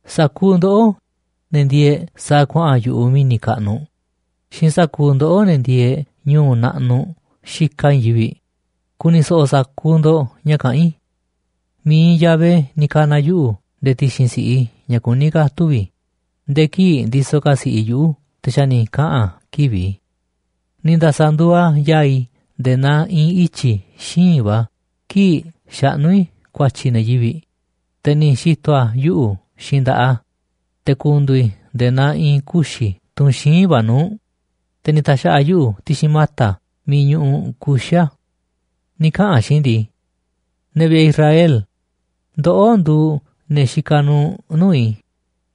Sa̱kuuꞌ ndoꞌó, ne̱ ndieeꞌ sa̱a̱ kuaꞌa̱n yu̱ꞌuꞌ mi̱ni̱ kaꞌnuꞌ xiinꞌ sa̱kuuꞌ ndoꞌó, ne̱ ndieeꞌ ñu̱u̱ naꞌnuꞌ xikaꞌ i̱i̱n yivi̱ꞌ, ku̱ni̱ so̱ꞌo̱ sa̱kuuꞌ ndo̱ꞌ ña̱ kaꞌán i̱. Mi̱iꞌ Yahvé ni̱ ka̱na̱ yuꞌu̱ nde̱e̱ ti̱xi̱n si̱ꞌiꞌ i̱ ña̱ kuní ka̱ tuvi̱ i̱. Nde̱e̱ kii̱ꞌ ndisoꞌ ka̱ si̱ꞌiꞌ i̱ yuꞌu̱ te̱ xa̱ ni̱ kaꞌa̱n a̱ kivi̱ꞌ i̱. Ni̱ nda̱sa̱ nduuꞌ a̱ yaa̱ꞌ i̱ nde̱e̱ naa i̱i̱n ityi̱ xíinꞌ va̱ kii̱ꞌ xaꞌnú i̱ ku̱a̱tyi̱ ne̱ yivi̱ꞌ, te̱ ni̱ xi̱to̱ a̱ yuꞌu̱ xiinꞌ nda̱ꞌaꞌ a̱, te̱ ku̱ndu̱u̱ i̱ nde̱e̱ naa i̱i̱n kuxi̱ tunꞌ xíinꞌ va̱ nuu̱ꞌ, te̱ ni̱ ta̱xa̱ꞌa̱ a̱ yuꞌu̱ ti̱xi̱n mata̱ miiꞌ ñuꞌuꞌ kuxi̱ a̱. Ni̱ kaꞌa̱n a̱ xiinꞌ i̱ ndii: “Ne̱ vi̱ꞌe̱ Israel, ndoꞌó nduuꞌ ne̱ xikaꞌ nuuꞌ nuu̱ꞌ i̱,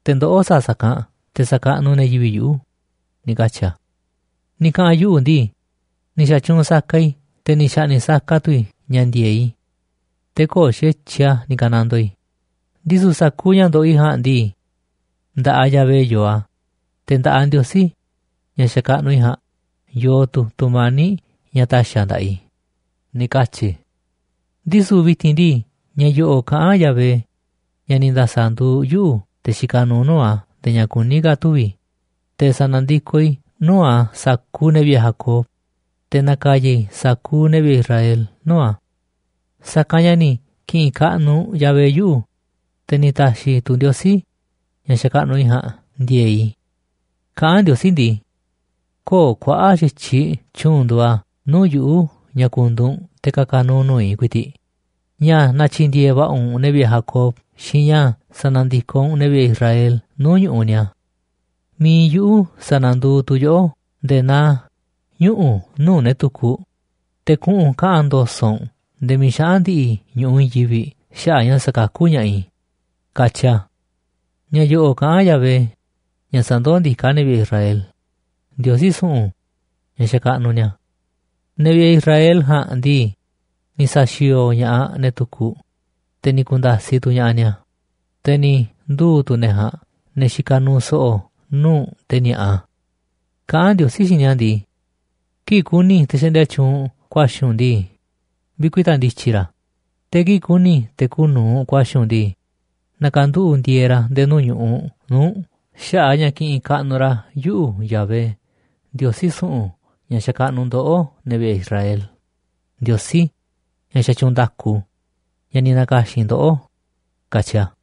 te̱ ndoꞌó sa̱a̱ sa̱kanꞌ te̱ sa̱kaꞌnuꞌ ne̱ yivi̱ꞌ yuꞌu̱”, ni̱ katyi̱ a̱. Ni̱ kaꞌa̱n yuꞌu̱ ndii: “Ni̱ xa̱tyuunꞌ saka i̱, te̱ ni̱ xa̱ꞌni̱ꞌ saka tu̱ i̱ ña̱ ndi̱e̱eꞌ i̱, te̱ köo̱ꞌ xa̱tyiꞌ a̱ ni̱ ka̱nandoo i̱. Ndisu̱ sa̱kuuꞌ ña̱ ndoꞌoꞌ i̱ ja̱a̱nꞌ ndii, nda̱ꞌaꞌ Yahvé yoo a̱, te̱ nda̱ꞌaꞌ Ndiosí, ña̱ xakaꞌnuꞌ i̱ ja̱a̱nꞌ, yoo tu̱ tu̱mani̱ꞌ ña̱ ta̱xi̱ a̱ nda̱ꞌaꞌ i̱”, ni̱ katyi̱ i̱. Ndisu̱ vi̱ti̱n ndii, ña̱ yo̱ꞌo̱ꞌ kaꞌán Yahvé, ña̱ ni̱ nda̱sa̱ nduuꞌ yuꞌu̱ te̱ xikaꞌ nuuꞌ nuu̱ꞌ a̱ nde̱e̱ ña̱ kuní ka̱ tuvi̱ i̱, te̱ sa̱na̱ndikoꞌ i̱ nuu̱ꞌ a̱ sa̱kuuꞌ ne̱ vi̱ꞌe̱ Jacob, te̱ na̱ka̱ya̱ i̱ sa̱kuuꞌ ne̱ vi̱ꞌe̱ Israel nuu̱ꞌ a̱. Sa̱kanꞌ ña̱ ni̱ ki̱ꞌi̱n kaꞌnuꞌ Yahvé yuꞌu̱, te̱ ni̱ ta̱xi̱ tu̱ Ndiosí, ña̱ xakaꞌnuꞌ i̱ ja̱a̱nꞌ, ndi̱e̱e̱ꞌ i̱. Kaꞌán Ndiosí ndii: “Köo̱ꞌ kuaꞌa̱ꞌ xa̱tyiꞌ tyu̱u̱n nduuꞌ a̱ nuu̱ꞌ yuꞌu̱ ña̱ ku̱ndu̱u̱ u̱nꞌ te̱ ka̱ka̱ nu̱u̱ nuu̱ꞌ i̱ ku̱i̱ti̱ꞌ, ña̱ na̱tyi̱ndi̱e̱e̱ va̱ꞌa̱ u̱nꞌ ne̱ vi̱ꞌe̱ Jacob xiinꞌ ña̱ sa̱na̱ndikoꞌ u̱nꞌ ne̱ vi̱ꞌe̱ Israel nuu̱ꞌ ñu̱ꞌuꞌ ni̱a̱. Mi̱iꞌ yuꞌu̱ sa̱na̱nduuꞌ tu̱ yoꞌó ndee naa ñuꞌu̱ nuu̱ꞌ ne̱ tukuꞌ, te̱ kuꞌu̱n kaꞌa̱n ndo̱so̱ꞌ u̱nꞌ nde̱e̱ miiꞌ xaꞌa̱n ndi̱ꞌi̱ ñu̱ꞌuꞌ i̱i̱n yivi̱ꞌ xaꞌa̱ꞌ ña̱ sa̱kakú ña̱ꞌaꞌ i̱”, katyi a̱. Ña̱ yo̱ꞌo̱ꞌ kaꞌán Yahvé, ña̱ sandoó ndiká ne̱ vi̱ꞌe̱ Israel, Ndiosí su̱ꞌu̱n ña̱ xakaꞌnuꞌ ni̱a̱. Ne̱ vi̱ꞌe̱ Israel ja̱a̱nꞌ ndii, ni̱ sa̱xi̱o̱o̱ ña̱ꞌaꞌ ne̱ tukuꞌ, te̱ ni̱ ku̱nda̱siꞌ tu̱ ña̱ꞌaꞌ ni̱a̱, te̱ ni̱ nduu̱ tu̱ ne̱ ja̱a̱nꞌ ne̱ xikaꞌ nuuꞌ so̱ꞌo̱ nuu̱ꞌ te̱ ni̱a̱ꞌa. Kaꞌán Ndiosí xiinꞌ ni̱a̱ ndii: “Kii̱ꞌ ku̱ni̱ te̱ xaꞌndia tyuunꞌ ku̱a̱xi̱ u̱nꞌ ndii, vi̱kuita̱ ndi̱tyi̱ ra̱. Te̱ kii̱ꞌ ku̱ni̱ te̱ kuuꞌ nu̱uꞌ ku̱a̱xi̱ u̱nꞌ ndii, na̱ka̱nduꞌu̱ꞌ ndi̱e̱e̱ ra̱ nde̱e̱ nuu̱ꞌ ñu̱ꞌuꞌ nuu̱ꞌ u̱nꞌ xaꞌa̱ꞌ a̱ ña̱ kiꞌinꞌ kaꞌnuꞌ ra̱ yuꞌu̱ Yahvé, Ndiosí su̱ꞌu̱n ña̱ xakaꞌnuꞌ ndoꞌó, ne̱ vi̱ꞌe̱ Israel, Ndiosí, ña̱ xatyuunꞌ nda̱ku, ña̱ ni̱ na̱ka̱xi̱n ndoꞌó”, katyi a̱.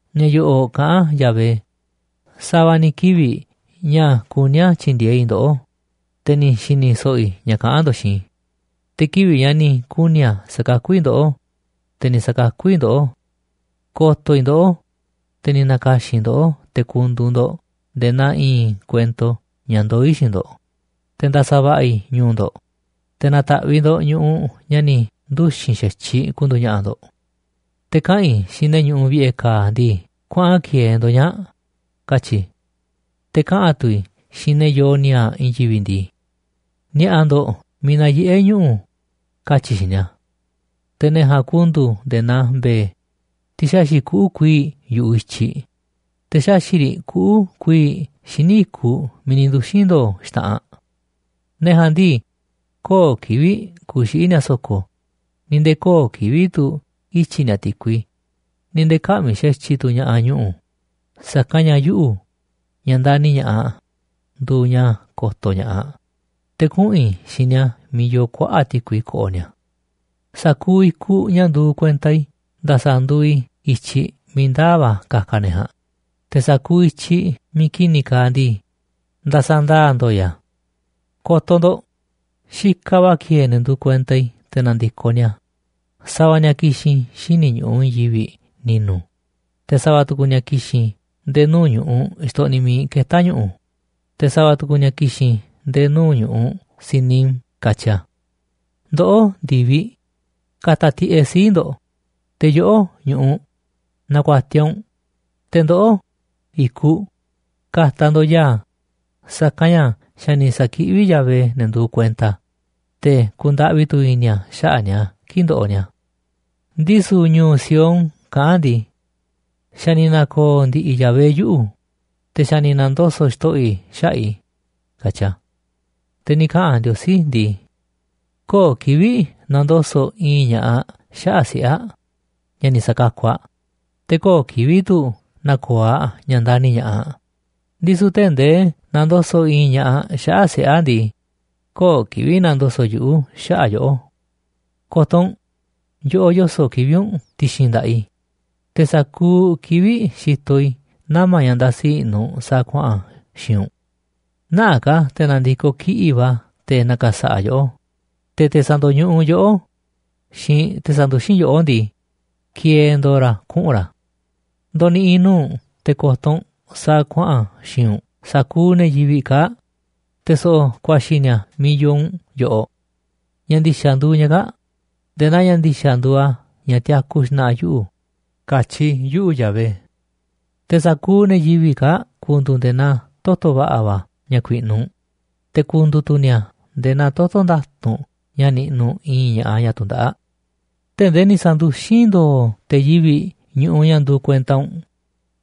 Ña̱ yo̱ꞌo̱ꞌ kaꞌán Yahvé: “Sa̱va̱ ni̱ kivi̱ꞌ ña̱ kuní a̱ tyi̱ndi̱e̱eꞌ i̱ ndoꞌó, te̱ ni̱ xi̱ni̱ so̱ꞌo̱ i̱ ña̱ kaꞌán ndo̱ꞌ xiinꞌ i̱. Te̱ kivi̱ꞌ ña̱ ni̱ kuni̱ a̱ sa̱kakú i̱ ndoꞌó, te̱ ni̱ sa̱kakú i̱ ndoꞌó. Ko̱to̱ i̱ ndoꞌó, te̱ ni̱ na̱ka̱xi̱n i̱ ndoꞌó te̱ ku̱ndu̱u̱ ndo̱ꞌ nde̱e̱ naa i̱i̱n kuento ña̱ ndoó i̱ xiinꞌ ndo̱ꞌ, te̱ nda̱sa̱ va̱ꞌa̱ꞌ i̱ ñu̱u̱ ndo̱ꞌ, te̱ na̱ta̱ꞌviꞌ ndo̱ꞌ ñu̱ꞌuꞌ ña̱ xa̱ ni̱ nduxi̱n xa̱tyiꞌ ku̱ndu̱u̱ ña̱ꞌa̱ ndo̱ꞌ. Te̱ kaꞌa̱n i̱ xiinꞌ ne̱ ñuꞌuꞌ vi̱ꞌe̱ ka̱a̱ ndii: Kuaꞌa̱n ki̱e̱e̱ ndo̱ꞌ ñaa̱ꞌ, katyi̱ i̱. ’Te̱ kaꞌa̱n tu̱ i̱ xiinꞌ ne̱ yoo ni̱a̱a̱ꞌ i̱i̱n yivi̱ꞌ ndii: Ni̱a̱ꞌa̱ ndo̱ꞌ miiꞌ nayiꞌé ñuꞌu̱, katyi̱ i̱ xiinꞌ ni̱a̱. Te̱ ne̱ ja̱a̱nꞌ ku̱ndu̱u̱ nde̱e̱ naa mbe̱e̱, tiꞌ xaxi̱ꞌ kuꞌu̱ kuii̱ꞌ yu̱ꞌuꞌ i̱tyiꞌ, te̱ xaxi̱ꞌ riꞌ kuꞌu̱ kuii̱ꞌ xíniꞌ i̱kuꞌ miiꞌ ni̱ nduxi̱n ndo̱o̱ xta̱ꞌanꞌ. Ne̱ ja̱a̱nꞌ ndii, köo̱ꞌ kivi̱ꞌ ku̱xiꞌi̱ ni̱a̱ so̱ko̱, ni̱ nde̱e̱ köo̱ꞌ kivi̱ꞌ tu̱ ityi̱ ni̱a̱ ti̱kui, ni̱ nde̱e̱ kä̱ꞌmi̱ xa̱tyiꞌ tu̱ ña̱ꞌaꞌ ñu̱ꞌu̱. Sa̱kanꞌ ña̱ yuꞌu̱, ña̱ ndani̱ ña̱ꞌaꞌ, nduuꞌ ña̱ ko̱to̱ ña̱ꞌaꞌ, te̱ kuꞌu̱n i̱ xiinꞌ ni̱a̱ miiꞌ yoo kuaꞌa̱ꞌ ti̱kui ko̱ꞌo̱ ni̱a̱. Sa̱kuuꞌ i̱kuꞌ ña̱ nduuꞌ kuenta i̱ nda̱sa̱ nduuꞌ i̱ i̱tyiꞌ miiꞌ ndaa̱ va̱ ka̱ka̱ ne̱ ja̱a̱nꞌ, te̱ sa̱kuuꞌ i̱tyiꞌ miiꞌ ki̱ni̱ kaaꞌ ndii, nda̱sa̱ ndaa̱ ndo̱o̱ i̱ a̱. Ko̱to̱ ndo̱ꞌ, xikaꞌ va̱ ki̱e̱e̱ ne̱ nduuꞌ kuenta i̱ te̱ na̱ndi̱koꞌ ni̱a̱. Sa̱va̱ ni̱a̱ ki̱xi̱n xíniꞌ ñu̱ꞌuꞌ i̱i̱n yivi̱ꞌ ni̱nu̱, te̱ sa̱va̱ tu̱ku̱ ni̱a̱ ki̱xi̱n nde̱e̱ nuu̱ꞌ ñu̱ꞌuꞌ xtoꞌniꞌ miiꞌ ketá ñu̱ꞌu̱, te̱ sa̱va̱ tu̱ku̱ ni̱a̱ ki̱xi̱n nde̱e̱ nuu̱ꞌ ñu̱ꞌuꞌ Sinim”, katyi̱ a̱. Ndoꞌó, ndi̱viꞌ, ka̱ta̱ tiꞌeꞌ sii̱ꞌ ndo̱ꞌ. Te̱ yoꞌó, ñu̱ꞌuꞌ, na̱ku̱a̱tiaꞌ u̱nꞌ. Te̱ ndoꞌó, i̱kuꞌ, ka̱ta̱ ndo̱ꞌ ya̱a̱, sa̱kanꞌ ña̱ xa̱ ni̱ sa̱kiꞌví Yahvé ne̱ nduuꞌ kuenta a̱, te̱ ku̱ndaꞌvi tu̱ i̱ni̱ a̱ xaꞌa̱ꞌ ni̱a̱ kii̱ꞌ ndoꞌoꞌ ni̱a̱. Ndisu̱ ñu̱u̱ Sión kaꞌán ndii: “Xa̱ ni̱ na̱ko̱o̱ ndi̱ꞌi̱ Yahvé yuꞌu̱, te̱ xa̱ ni̱ na̱ndoso̱ꞌ Xto̱ꞌo̱ i̱ xaꞌa̱ꞌ i̱”, katyi a̱. Te̱ ni̱ kaꞌa̱n Ndiosí ndii: “Köo̱ꞌ kivi̱ꞌ na̱ndoso̱ꞌ i̱i̱n ña̱ꞌaꞌ xaꞌa̱ꞌ siꞌe̱ aꞌ ña̱ ni̱ sa̱kakuꞌ aꞌ. Te̱ köo̱ꞌ kivi̱ꞌ tu̱ na̱ko̱o̱ aꞌ ña̱ ndani̱ ña̱ꞌaꞌ aꞌ. Ndisu̱ tee̱ꞌ ndee na̱ndoso̱ꞌ i̱i̱n ña̱ꞌaꞌ xaꞌa̱ꞌ siꞌe̱ aꞌ ndii, köo̱ꞌ kivi̱ꞌ na̱ndoso̱ꞌ yuꞌu̱ xaꞌa̱ꞌ yoꞌó. Ko̱to̱ u̱nꞌ, yoꞌoꞌ yoso̱ꞌ kivi̱ꞌ u̱nꞌ ti̱xi̱n nda̱ꞌaꞌ i̱. Te̱ sa̱kuuꞌ kivi̱ꞌ xitoꞌ i̱ nama̱ ña̱ ndasi i̱ꞌnu̱ sa̱a̱ kuaꞌa̱n xi̱i̱nꞌ u̱nꞌ. Nä̱ꞌaꞌ ka̱ te̱ na̱ndi̱koꞌ kiꞌi̱ꞌ va̱ te̱ na̱ka̱sa̱ꞌa̱ yoꞌó. Te̱ te̱ sa̱ndo̱ñuꞌuꞌ yoꞌó xiinꞌ te̱ sanduxín yoꞌó ndii, ki̱e̱e̱ ndo̱o̱ ra̱ kuꞌu̱n ra̱. Ndo̱ni̱ꞌi̱ nuu̱ꞌ u̱nꞌ te̱ ko̱to̱ u̱nꞌ sa̱a̱ kuaꞌa̱n xi̱i̱nꞌ u̱nꞌ sa̱kuuꞌ ne̱ yivi̱ꞌ kaa̱ꞌ, te̱ so̱ꞌo̱ ku̱a̱xi̱ ni̱a̱ miiꞌ yoo u̱nꞌ yoꞌoꞌ. Ña̱ ndi̱xa̱ nduuꞌ ña̱ kaa̱ꞌ nde̱e̱ naa ña̱ ndi̱xa̱ nduuꞌ a̱ ña̱ tiaku xna̱ꞌa̱ yuꞌu̱, katyi yuꞌu̱, Yahvé. Te̱ sa̱kuuꞌ ne̱ yivi̱ꞌ kaa̱ꞌ ku̱ndu̱u̱ nde̱e̱ naa toto̱ va̱ꞌa̱ va̱ ña̱ ku̱i̱ꞌnu̱ u̱nꞌ, te̱ ku̱ndu̱u̱ tu̱ ni̱a̱ nde̱e̱ naa toto̱ nda̱tu̱nꞌ ña̱ niꞌnuꞌ i̱i̱n ña̱ꞌaꞌ ñaꞌ tundaꞌáꞌ. ’Tee̱ꞌ ndee ni̱ sa̱nduxín ndo̱o̱ te̱ yivi̱ꞌ ñu̱ꞌuꞌ ña̱ nduu kuenta u̱nꞌ,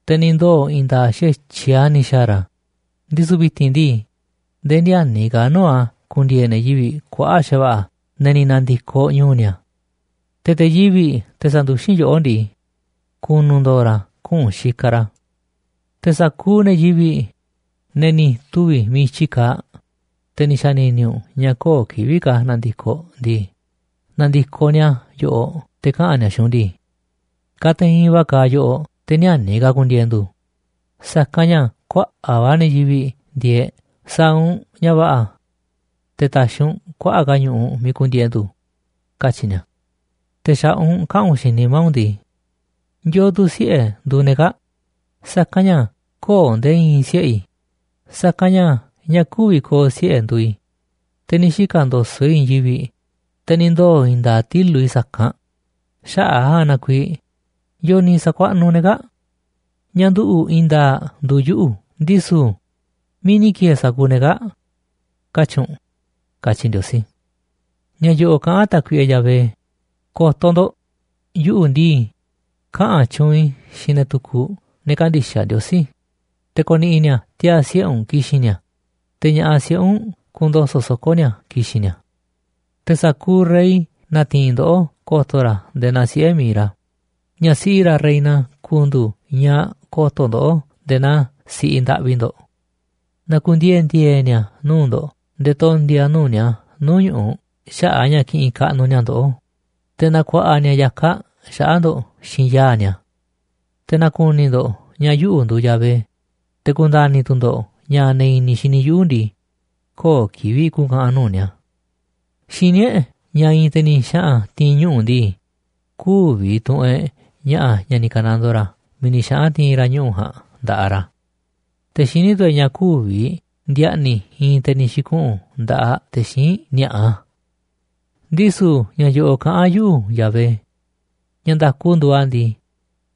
te̱ ni̱ ndoo̱ i̱i̱n nda̱a̱ꞌ xa̱tyiꞌ a̱ ni̱ xa̱a̱ ra̱, ndisu̱ vi̱ti̱n ndii, nde̱e̱ ni̱ä̱ni̱ ka̱ nuu̱ꞌ a̱ ku̱ndi̱e̱e̱ ne̱ yivi̱ꞌ kuaꞌa̱ꞌ xa̱va̱ꞌa̱ ne̱ ni̱ na̱ndi̱koꞌ ñu̱u̱ ni̱a̱. Te̱ te̱ yivi̱ꞌ te̱ sa̱nduxín yoꞌó ndii, ku̱nu̱ ndo̱o̱ ra̱ kuꞌu̱n xikaꞌ ra̱. Te̱ sa̱kuuꞌ ne̱ yivi̱ꞌ, ne̱ ni̱ tuvi̱ miiꞌ i̱tyi kaaꞌ, te̱ ni̱ xa̱ni̱ni̱ u̱nꞌ ña̱ köo̱ꞌ kivi̱ꞌ ka̱ na̱ndi̱koꞌ ndii, na̱ndi̱koꞌ ni̱a̱ yoꞌoꞌ te̱ kaꞌa̱n ni̱a̱ xiinꞌ u̱nꞌ ndii: Kateinꞌ va̱ kaaꞌ yoꞌoꞌ te̱ ni̱ä̱ni̱ ka̱ ku̱ndi̱e̱e̱ ndu̱ꞌ, sa̱kanꞌ ña̱ kuaꞌa̱ꞌ va̱ ne̱ yivi̱ꞌ ndieeꞌ. Sa̱a̱ u̱nꞌ ña̱ va̱ꞌa̱ te̱ ta̱xi̱ u̱nꞌ kuaꞌa̱ꞌ ka̱ ñu̱ꞌuꞌ miiꞌ ku̱ndi̱e̱e̱ ndu̱, katyi̱ ni̱a̱. Te̱ xa̱ꞌaꞌ u̱nꞌ kaꞌa̱n u̱nꞌ xiinꞌ nimá u̱nꞌ ndii: ¿Yo̱o̱ tu̱ siꞌe̱ nduuꞌ ne̱ kaa̱ꞌ? Sa̱kanꞌ ña̱ köo̱ꞌ nde̱e̱ i̱i̱n siꞌe̱ i̱, sa̱kanꞌ ña̱ ñaꞌ kü̱vi̱ ko̱o̱ siꞌe̱ nduuꞌ i̱. Te̱ ni̱ xika̱ ndo̱so̱ꞌ i̱ i̱i̱n yivi̱ꞌ, te̱ ni̱ ndoo̱ i̱i̱n nda̱a̱ꞌ tilu̱ꞌ i̱ sa̱kanꞌ. Xaꞌa̱ꞌ a̱ ja̱a̱nꞌ na kuiiꞌ, ¿yo̱o̱ ni̱ sa̱kuaꞌnuꞌ ne̱ kaa̱ꞌ? Ñaꞌ nduꞌu̱ꞌ i̱i̱n nda̱a̱ꞌ nduuꞌ yuꞌu̱ ndisu̱, ¿miiꞌ ni̱ ki̱e̱e̱ sa̱kuuꞌ ne̱ kaa̱ꞌ?, katyi̱ u̱nꞌ”, katyi Ndiosí. Ña̱ yo̱ꞌo̱ꞌ kaꞌán Tákuiꞌe Yahvé: “Ko̱to̱ ndo̱ꞌ, yuꞌu̱ ndii, kaꞌa̱n tyuunꞌ i̱ xiinꞌ ne̱ tukuꞌ, ne̱ kändixaꞌ Ndiosí, te̱ ko̱ni̱ꞌi̱ ni̱a̱ tiaa̱ siꞌe̱ u̱nꞌ ki̱xi̱n ni̱a̱, te̱ ña̱ꞌaꞌ siꞌe̱ u̱nꞌ ku̱ndo̱so̱ꞌ soko̱ ni̱a̱ ki̱xi̱n ni̱a̱. Te̱ sa̱kuuꞌ rey na̱ti̱i̱n ndoꞌó ko̱to̱ ra̱ nde̱e̱ naa siꞌe̱ mi̱iꞌ ra̱, ña̱ siꞌi ra̱ reina ku̱ndu̱u̱ ñaꞌ ko̱to̱ ndoꞌó nde̱e̱ naa si̱ꞌiꞌ ndaꞌvi ndo̱ꞌ. Na̱ku̱ndiee̱ ndi̱e̱e̱ ni̱a̱ nuu̱ꞌ ndo̱ꞌ nde̱e̱ tondi̱a̱ nuu̱ꞌ ni̱a̱ nuu̱ꞌ ñu̱ꞌuꞌ xaꞌa̱ꞌ ña̱ kiꞌinꞌ kaꞌnuꞌ ni̱a̱ ndoꞌó, te̱ na̱ku̱a̱ꞌa̱ ni̱a̱ ya̱kaꞌ xaꞌa̱ꞌ ndo̱ꞌ xiinꞌ yaa̱ꞌ ni̱a̱. Te̱ na̱ku̱ni̱ ndo̱ꞌ ña̱ yuꞌu̱ nduuꞌ Yahvé, te̱ ku̱nda̱ni̱ tu̱ ndo̱ꞌ ña̱ ne̱ i̱ni̱ xini yuꞌu̱ ndii, köo̱ꞌ kivi̱ꞌ ku̱ka̱ꞌa̱n nuu̱ꞌ ni̱a̱.” Xiní e̱ꞌ ña̱ i̱i̱n te̱ ni̱ xaꞌa̱n ti̱i̱n ñuꞌu̱ ndii, kü̱vi̱ tu̱ꞌu̱n e̱ꞌ ña̱ꞌa̱ ña̱ ni̱ ka̱nandoo ra̱ miiꞌ ni̱ xaꞌa̱n ti̱i̱n ra̱ ñuꞌu̱ ja̱a̱nꞌ nda̱ꞌaꞌ ra̱. Te̱ xiní tu̱ e̱ꞌ ña̱ kü̱vi̱ ndi̱a̱ꞌni̱ i̱i̱n te̱ ni̱ xi̱kuꞌu̱n nda̱ꞌaꞌ te̱ xíinꞌ ni̱a̱ꞌa. Ndisu̱ ña̱ yo̱ꞌo̱ꞌ kaꞌán Yahvé: “Ña̱ nda̱ku nduuꞌ a̱ ndii,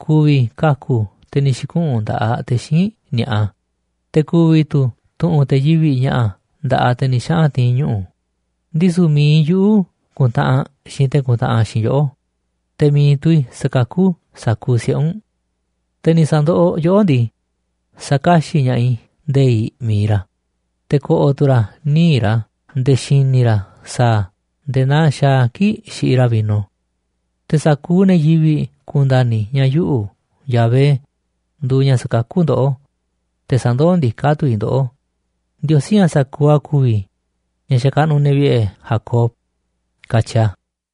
ku̱vi̱ kaku̱ te̱ ni̱ xi̱kuꞌu̱n nda̱ꞌaꞌ te̱ xíinꞌ ni̱a̱ꞌa, te̱ ku̱vi̱ tu̱ tu̱ꞌu̱n te̱ yivi̱ꞌ ña̱ꞌa̱ nda̱ꞌaꞌ te̱ ni̱ xaꞌa̱n ti̱i̱n ñuꞌu̱. Ndisu̱ mi̱iꞌ yuꞌu̱ ku̱ntaꞌanꞌ xiinꞌ te̱ kuntaꞌanꞌ xiinꞌ yoꞌó, te̱ mi̱iꞌ tu̱ i̱ sa̱kakú sa̱kuuꞌ siꞌe̱ u̱nꞌ. Te̱ ni̱ sa̱ndoꞌoꞌ yoꞌó ndii, sa̱kaxi̱ꞌ ña̱ꞌaꞌ i̱ nde̱i̱ꞌ mi̱iꞌ ra̱, te̱ ko̱ꞌo̱ tu̱ ra̱ níiꞌ ra̱ nde̱e̱ xi̱ni̱ ra̱ sa̱a̱ a̱ nde̱e̱ naa xaaꞌ a̱ kii̱ꞌ xiꞌiꞌ ra̱ vino. Te̱ sa̱kuuꞌ ne̱ yivi̱ꞌ ku̱nda̱ni̱ ña̱ yuꞌu̱, Yahvé, nduuꞌ ña̱ sa̱kakú ndoꞌó, te̱ sandoó ndiká tu̱ i̱ ndoꞌó, Ndiosí ña̱ sa̱kuuꞌ a̱ ku̱vi̱, ña̱ xakaꞌnuꞌ ne̱ vi̱ꞌe̱ Jacob”, katyi a̱.